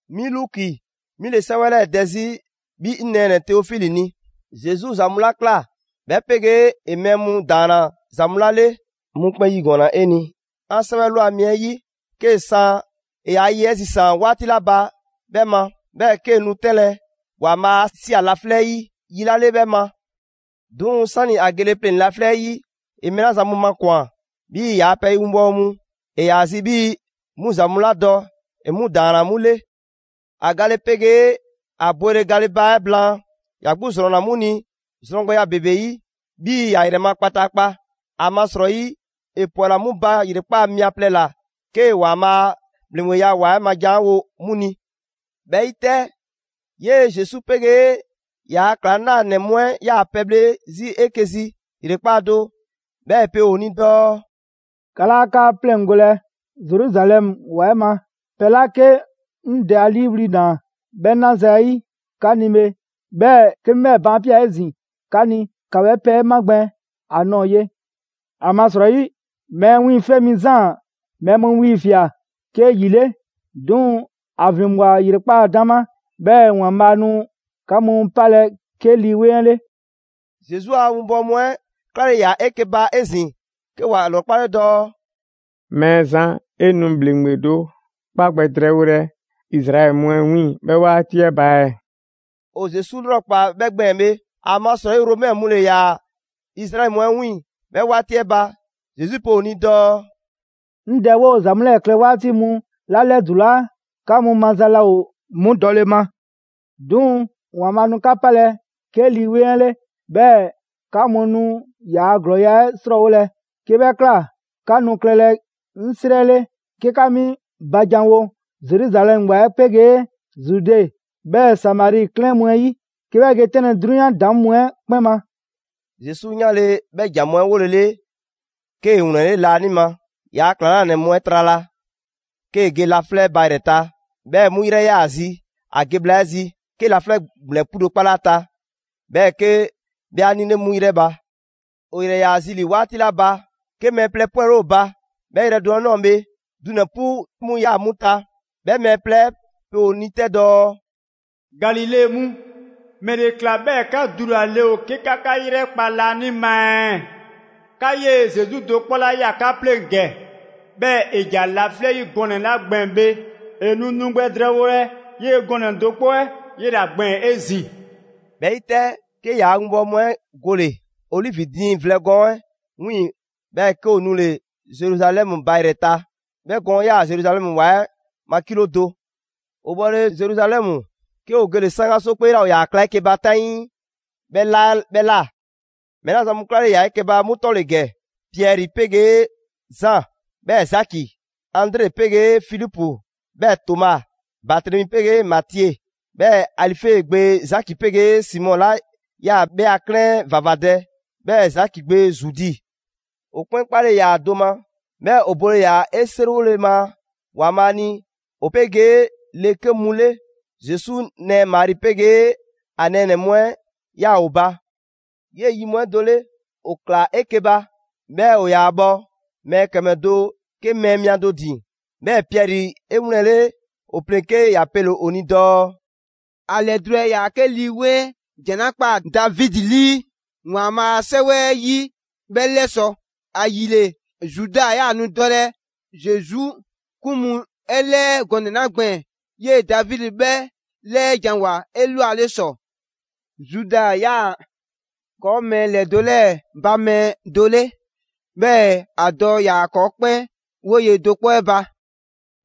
'Mi Luki, 'mi ‑le 'sɛwɛ 'lɛɛ‑ dɛ 'zi 'bhi 'ŋ nɛɛnɛ‑ Teofili ni. Zesu ‑za mu 'la ꞊kla, 'bhɛ 'pegee ‑e mɛɛ mu ‑daanna ‑za mu 'la 'le, 'ŋ 'mu 'kpɛn 'yigɔɔnna 'e ni 'an 'sɛwɛ ꞊lwa mi 'ɛ 'yi, 'ke 'an san ‑e ‑yaa' ye 'ɛ zisaan‑ 'waati 'la ba 'bhɛ ma, 'bhɛɛ‑ 'kee‑ nu 'tɛnlɛ‑ ‑Waanbhaa' 'a ꞊sia laflɛ' 'ɛ 'yi yi 'la 'le 'bhɛ ma. 'Duŋ‑ 'sani‑ ‑a gele pleŋ‑ laflɛ' 'ɛ 'yi, ‑e mɛɛ 'la zan mu makwan‑ 'bhii‑ ‑yaa' pɛ winbɔwo mu, ‑e ‑yaa zi 'bhii‑ 'mu ‑za mu 'la dɔ, ‑e 'mu ‑daanna 'mu 'le. ‑A gale 'pegee ‑a bwele gale ba 'ɛ blaan, ‑ya 'gbu ‑zrɔnna 'mu ni zrɔn gbɛya ‑bebe 'yi 'bhii‑ ‑ya ‑yrɛ ma kpataakpa. ‑Amasrɔyi ‑e ‑pwɛla 'mu ba ‑yrekpaa' mia plɛ ꞊la, 'kee‑ ‑Waanbhaa' a ‑bhleŋgbeya ‑wa 'ɛ ma ‑jan 'ɛ wo 'mu ni. 'Bhɛ 'yi 'tɛ, 'yee‑ Zesu 'pegee ‑yaa' ‑klaŋlanɛ mu 'ɛ 'yaa‑ pɛbhle 'zi 'eke‑ zi ‑yrekpaa' do, 'bhɛɛ‑ ‑e pe ‑o ni dɔɔ: «'Ka 'laa 'ka 'pleŋgolɛ Zeruzalɛmu ‑wa 'ɛ ma; pɛ 'la 'ke 'ŋ Dɛ 'a 'liiwli‑ ꞊naa 'bhɛ 'na zayi' 'ka ni bhe, 'bhɛɛ‑ 'ke 'mi 'bhɛɛ‑ baan' ꞊pia 'ezin‑ 'ka ni; ‑ka 'bhɛ pɛ 'ɛ magbɛn a ꞊nɔɔ ye. ‑Amasrɔyi Mɛɛ Wiiŋfɛ' Mi Zaan mɛɛ mu 'wiiŋfia꞊ 'ke ‑yi 'le, 'duŋ‑ ‑a ‑vinbwa ‑yrekpaa' 'dama 'bhɛɛ‑ ‑Waanbhaa' nu 'ka mu 'palɛ‑ 'ke Lii 'Weŋ 'ɛ 'le.» Zesu a 'winbɔwo mu 'ɛ 'klale‑ ‑yaa 'eke‑ ba 'ezin‑, 'ke ‑wa ‑lrɔkpale dɔɔ: «Mɛɛzan, 'e nu ‑bhleŋgbe do 'kpa gbɛ drɛɛwolɛ Izraɛli mu 'ɛ 'wiiŋ‑ 'bhɛɛ‑ 'waati 'ɛ ba ɛɛ?» (‑O Zesu 'lrɔkpaa 'bhɛ gbɛɛn‑ bhe, ‑amasrɔyi Romɛ mu ‑le ‑yaa Izraɛli mu 'ɛ 'wiiŋ‑ 'bhɛ 'waati 'ɛ ba.) Zesu pe ‑o ni dɔɔ: «'Ŋ Dɛ 'woo‑ za mu 'lɛɛ‑ klɛ 'waati mu 'la 'lɛdulaa, 'ka mu maza laa ‑o 'mu dɔle ma. 'Duŋ‑ ‑Waanbhaa' nu 'ka 'palɛ‑ 'ke Lii 'Weŋ 'ɛ 'le, 'bhɛɛ‑ 'ka mu nu ‑yaa' ‑glɔɔya' 'ɛ 'srɔɔwolɛ. 'Ke 'bhɛ ꞊kla, 'ka nu klɛlɛ 'ŋ 'srɛ 'le 'ke 'ka 'mi ba janwo Zeruzalɛmu ‑wa 'ɛ 'pegee Zude, 'bhɛɛ‑ Samari 'klɛɛn mu 'ɛ 'yi, 'ke 'bhɛ ge 'tɛnlɛ‑ 'drunyan ‑daŋ' mu 'ɛ 'kpɛn ma.» Zesu 'yanle‑ 'bhɛ ‑jan mu 'ɛ 'wolele, 'kee‑ ‑wlɛnle' laanima ‑yaa' ‑klaŋlanɛ mu 'ɛ trala, 'kee‑ ge laflɛ' ba ‑yrɛ ta; 'bhɛɛ‑ 'mu 'yrɛ ꞊yaa ‑a zi ‑a ge bhla 'ɛ zi; 'ke laflɛ' ‑gblɛn 'pu do 'kpale ‑a ta, 'bhɛɛ‑ 'ke 'bhɛ 'a 'nile 'mu ‑yrɛ ba. ‑O ‑yrɛ ‑yaa ‑a zi ‑li 'waati 'la ba, 'ke mɛɛ plɛ 'pwɛle ‑o ba 'bhɛ yrɛ do 'ɛ꞊nɔɔ bhe: dunɛ‑ 'pu mu ‑yaa 'mu ta. 'Bhɛ mɛɛ plɛ 'ɛ pe ‑o ni 'tɛ dɔɔ: «Galile mu, ‑mɛle ꞊kla 'bhɛɛ‑ 'ka dulale ‑o 'ke 'ka 'ka 'yrɛkpa laanima ɛɛ? 'Ka 'yee‑ Zesu do 'kpɔ 'la ꞊ya 'ka pleŋ‑ ‑gɛ, 'bhɛɛ‑ ‑e ‑ja laflɛ' 'yi gɔnɛ‑ 'la gbɛɛn‑ bhe, ‑e nu nu gbɛ drɛɛwolɛ 'yee‑ gɔnɛ‑ do 'kpɔ 'ɛ 'yela‑ gbɛɛn‑ 'ezin‑.» 'Bhɛ 'yi 'tɛ, 'ke ‑yaa' winbɔwo mu 'ɛ gole‑ OLivi diiŋ vlɛ gɔɔn 'ɛ 'wiiŋ‑, 'bhɛɛ‑ 'ke ‑o nule‑ Zeruzalɛmu ba ‑yrɛ ta. 'Bhɛ gɔɔn 'ɛ 'yaa‑ Zeruzalɛmu ‑wa 'ɛ ma kilo do. ‑O bhɔle Zeruzalɛmu, 'ke ‑o gele‑ 'saŋgaso 'kpee 'la ‑o ‑yaa kla 'eke‑ ba 'taŋii 'bhɛ ꞊la 'bhɛɛ‑ ꞊la. Mɛɛ 'la zan mu 'klale‑ ‑yaa 'eke‑ ba 'mu 'tɔ ‑le ‑gɛ: Piɛri 'pegee Zaan 'bhɛɛ‑ Zaki, Andre pegee Filipu 'bhɛɛ‑ Toma, Batremi 'pegee Matie, 'bhɛɛ‑ Alife gbe Zaki 'pegee Simɔ 'la 'yaa‑ 'bhɛ a 'klɛɛn 'ɛ ‑vavadɛ, 'bhɛɛ‑ Zaki gbe Zudi. ‑O 'kpɛn 'kpale‑ ‑yaa do ma, 'bhɛɛ‑ ‑o bole ‑yaa ‑o seriwole ma ‑Waanbhaa' ni ‑o 'pegee le 'ke mu 'le. Zesu nɛɛ Mari 'pegee ‑a nɛɛnɛ‑ mu 'ɛ 'yaa‑ ‑o ba. 'Yee‑ yi mu 'ɛ do 'le, ‑o ꞊klaa 'eke‑ ba, 'bhɛɛ‑ ‑o ‑yaa bhɔ mɛɛ ‑kɛmɛ do 'ke mɛɛ mia do ‑din. 'Bhɛɛ‑ Piɛri 'e 'wlɛnle‑ ‑o pleŋ‑ 'ke ‑ya pele‑ ‑o ni dɔɔ: «‑A ‑lɛdulale ‑yaa 'ke Lii 'Weŋ 'ɛ ‑jan 'la ꞊kpaa Davidi 'lii ‑Waanbhaa' a 'Sɛwɛ 'ɛ 'yi 'bhɛ 'lɛsɔ‑. ‑Ayile, Zuda 'yaa‑ nu dɔlɛ Zesu 'kun mu 'ɛ 'lɛɛ gɔnɛ‑ 'la gbɛɛn‑, 'yee‑ Davidi 'bhɛ 'lɛɛjanwoa 'elwale ‑sɔ. Zuda ‑yaa ‑kɔɔ' mɛɛ ‑lɛdo 'lɛɛ‑ ba mɛɛ 'ɛ do 'le, 'bhɛɛ‑ ‑a dɔ ‑yaa ‑kɔɔ' 'kpɛn 'woye‑ do 'kpɔ 'ɛ ba.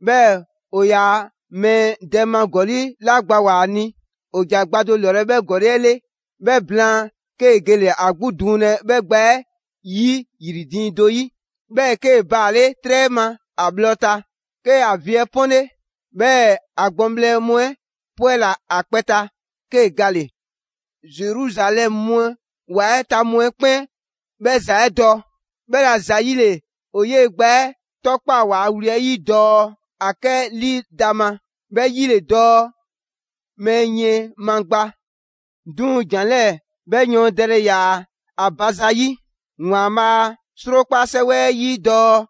'Bhɛɛ‑ ‑o yaa mɛɛ dɛ ma ‑gɔli' 'la gbawoa‑ ‑a ni, ‑e ‑ja gba do lɔlɛ 'bhɛ ‑gɔli' 'ɛ 'le. 'Bhɛ blaan 'kee‑ gele‑ ‑a 'gbu duŋlɛ 'bhɛ gba 'ɛ 'yi ‑yri diiŋ 'ɛ do 'yi, 'bhɛɛ‑ 'kee‑ baale' 'trɛ ma ‑a bhlɔ ta. 'Ke ‑a vi 'ɛ 'pɔnle, 'bhɛɛ‑ ‑a gbɔŋbhlɛ mu 'ɛ 'pwɛla‑ ‑a kpɛ ta, 'kee‑ gale‑. Zeruzalɛmu ‑wa 'ɛ ta mu 'ɛ 'kpɛn 'bhɛ ‑za 'ɛ dɔ. 'Bhɛla‑ ‑zayile ‑o 'yee‑ gba 'ɛ 'tɔkpaa‑ ‑waa' wli 'ɛ 'yi dɔɔ: ‹Akɛlidama›. 'Bhɛ 'yi ‑le dɔɔ: ‹mɛɛ yiɛn ma gba›. 'Duŋ‑ ‑jan 'lɛɛ‑ 'bhɛɛ‑ yɔɔndɛle ‑yaa ‑a ba zayi' ‑Waanbhaa a 'Srokpa 'sɛwɛ 'ɛ 'yi dɔɔ: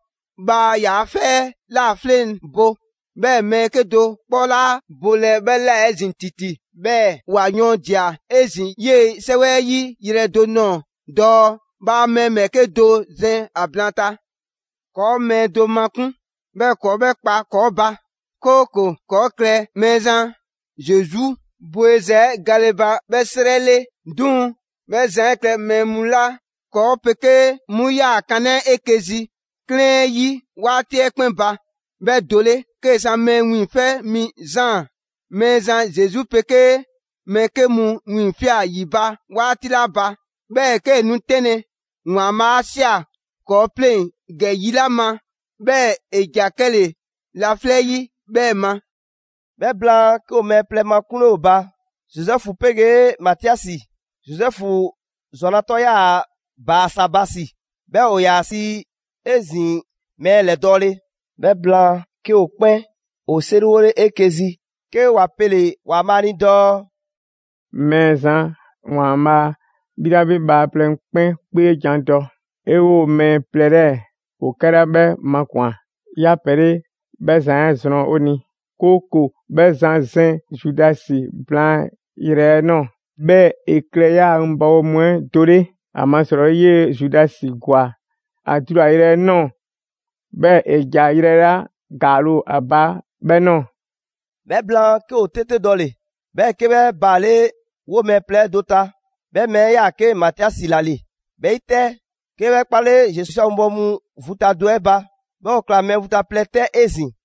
‹Bhaa yaa 'fɛ 'ɛ ꞊la 'fleŋbo, 'bhɛɛ‑ mɛɛ 'kedo‑ 'kpɔ 'laa bolɛ 'bhɛ ꞊la 'ezin‑ ‑titi.› 'Bhɛɛ‑ ‑wa yɔɔndia‑ 'ezin‑ 'yee‑ 'sɛwɛ 'ɛ 'yi yrɛ do ꞊nɔɔ dɔɔ: ‹Bhaa mɛɛ ‑bhɛɛke' do zɛn ‑a blaanta.› ‑Kɔɔ' mɛɛ do makun', 'bhɛɛ‑ 'kɔɔ 'bhɛ kpa ‑kɔɔ' ba, 'kooko‑ ‑kɔɔ' klɛ Mɛɛzan Zesu bweza 'ɛ gale ba 'bhɛ 'srɛ 'le. 'Duŋ‑ 'bhɛ zan 'ɛ klɛ mɛɛ mu 'la ‑kɔɔ' 'pegee 'mu 'yaa‑ kanaa' 'eke‑ zi 'klɛɛn 'ɛ 'yi 'waati 'ɛ 'kpɛn ba, 'bhɛɛ do 'le; 'kee‑ san Mɛɛ Wiiŋfɛ' Mi Zaan Mɛɛzan Zesu 'pegee mɛɛ 'ke mu 'wiiŋfia꞊ ‑yi ba 'waati 'la ba, 'bhɛɛ‑ 'kee‑ nu 'tɛnlɛ‑ ‑Waanbhaa' 'a ꞊sia ‑kɔɔ' 'pleŋ ‑gɛ yi 'la ma, 'bhɛɛ‑ ‑e ‑ja 'kɛle‑ laflɛ' 'yi 'bhɛ ma.» 'Bhɛ blaan, 'ke ‑o mɛɛ plɛ makunle ‑o ba: Zozɛfu 'pegee Matiasi. Zozɛfu ‑zwana' 'tɔ 'yaa‑ Baasabasi; 'bhɛɛ‑ ‑o ‑yaa ‑a sii 'ezin‑ mɛɛ ‑lɛdɔɔle. 'Bhɛ blaan, 'ke ‑o 'kpɛn ‑o 'seriwole 'eke‑ zi, 'ke ‑wa pele‑ ‑Waanbhaa' ni dɔɔ: «Mɛɛzan ‑Waanbhaa', 'bhi 'la 'bhi bhaaplɛŋ 'kpɛn 'kpeejan‑ dɔ, 'e 'woo‑ mɛɛ plɛ 'lɛɛ‑ ‑o 'kɛla 'bhɛ makwan‑ 'yaa‑ pɛ 'le, 'bhɛ zan 'ɛ zrɔn 'o ni, 'kooko‑ 'bhɛ zan zɛn Zudasi blaan yrɛ 'ɛ ꞊nɔɔ, 'bhɛɛ‑ ‑e klɛ 'yaa‑ 'winbɔwo mu 'ɛ do 'le. ‑Amasrɔyi 'yee‑ Zudasi ‑gwa ‑a dulayrɛ 'ɛ ꞊nɔɔ, 'bhɛɛ‑ ‑e ‑ja yrɛ 'la ‑gaale' ‑o ‑a ba 'bhɛ ꞊nɔɔ.» 'Bhɛ blaan, 'ke ‑o 'tete dɔle‑, 'bhɛɛ‑ 'ke 'bhɛ baale' 'woo‑ mɛɛ plɛ 'ɛ do ta. 'Bhɛ mɛɛ 'ɛ ‑yaa 'ke Matiasi ‑la ‑le. 'Bhɛ 'yi 'tɛ, 'ke 'bhɛ 'kpale Zesu a 'winbɔwo mu vu ta do 'ɛ ba, 'bhɛɛ‑ ‑o ꞊kla mɛɛ vu ta plɛ 'tɛ 'ezin‑.